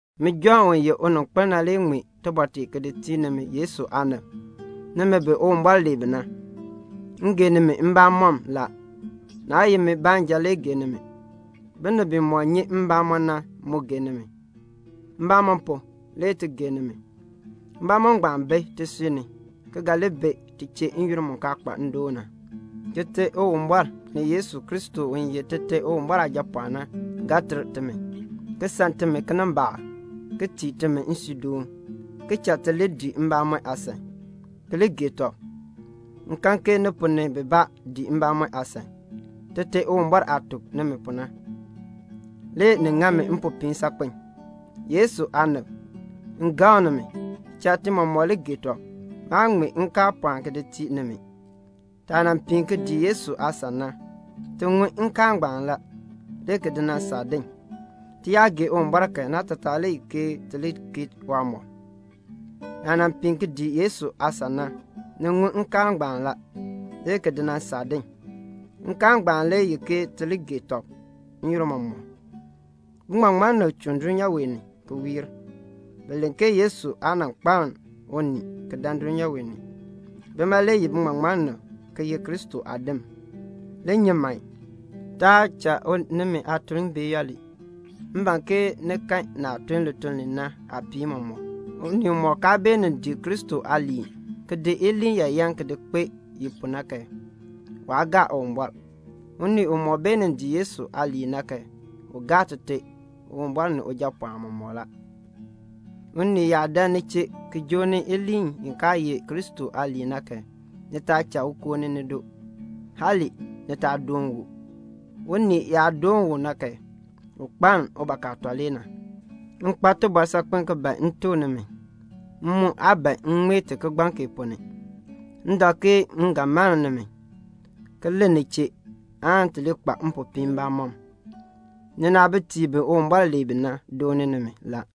Min Jɔnn u ye uninkpil na ŋmee tibɔr tee ki di tii nimi Yesu aanib, nimi bi Uwumbɔr lee bi na. M gee nimi mbamɔm la. Naa ye min baanja le gee nimi. Binib bimɔk nyi mbamɔn na mu gee nimi. Mbamɔn pu, le ti gee nimi. Mbamɔn ngbaan bi tisui ni, ki ga li bi ti chee n-yoonn mu kaa kpa ndoon na. Tite Uwumbɔr, ni Yesu Kristo u ye Tite Uwumbɔr Aajapɔɔn na, ga ter timi, ki san timi kinimbaak, ki tii timi nsuudoon, ki cha ti li dii mbamɔn aasan, ki li gee tɔb. M kan ke ni ponn ni bibaa dii mbamɔn aasan, Tite Uwumbɔr aah tuk timi pu na. Le ni ŋa mi mpopiin saakpen. Yesu aanib, n gaŋ nimi, cha ti mɔmɔk li gee tɔb. Maa ŋmee nkaal pɔɔn ki di tii nimi. Taah nan piin ki dii Yesu aasan na, ti ŋun nkaal ngbaan la, le ki di nan saa din. Ti yaa gee Uwumbɔr kan, naatataa le ye ke ti li keei waamɔb. Naah nan piin ki dii Yesu aasan na, ni ŋun nkaal ngbaan la, le ki di nan saa din. Nkaal ngbaan le ye ke ti li gee tɔb n-yoonn mɔmɔk. Biŋmaŋmannim chuun dulnyaa wee ni ki wiir la. Bi len ke Yesu Kristo aa nan kpaln unii ki dan dulnyaa wee ni. Bima le ye biŋmaŋmannim ki ye Kristo aadim la. Li nyi man, taa cha nimi aatuln bee yooli. M ban ke ni kan naah tun lituln li na aapiin mɔmɔk. Unii umɔk kaa beenin dii Kristo aaliin, ki di iliin yaayan ki di kpee i pu na kan, waa gaa Uwumbɔr. Unii umɔk beenin dii Yesu aaliin na kan, u gaa Tite Uwumbɔr ni Ujapɔɔn mɔmɔk la. Unii yaa dan ni chee ki joo ni iliin i kaa ye Kristo aaliin na kan, ni taa cha u koo ni nido. Hali ni taa doon u. Unii u yaa doon u na kan, u kpaln ubakaatɔ le na. M kpa tibɔr saakpen ki ban m tuk nimi; m mu aa ban m ŋmee ti kigbaŋ kee ponn ni. M dak ke m ga mann nimi, ki len ni chee, aan ti li kpa mpopiin mbamɔm. Ninaabitiib bi Uwumbɔr lee bi na dooni nimi la.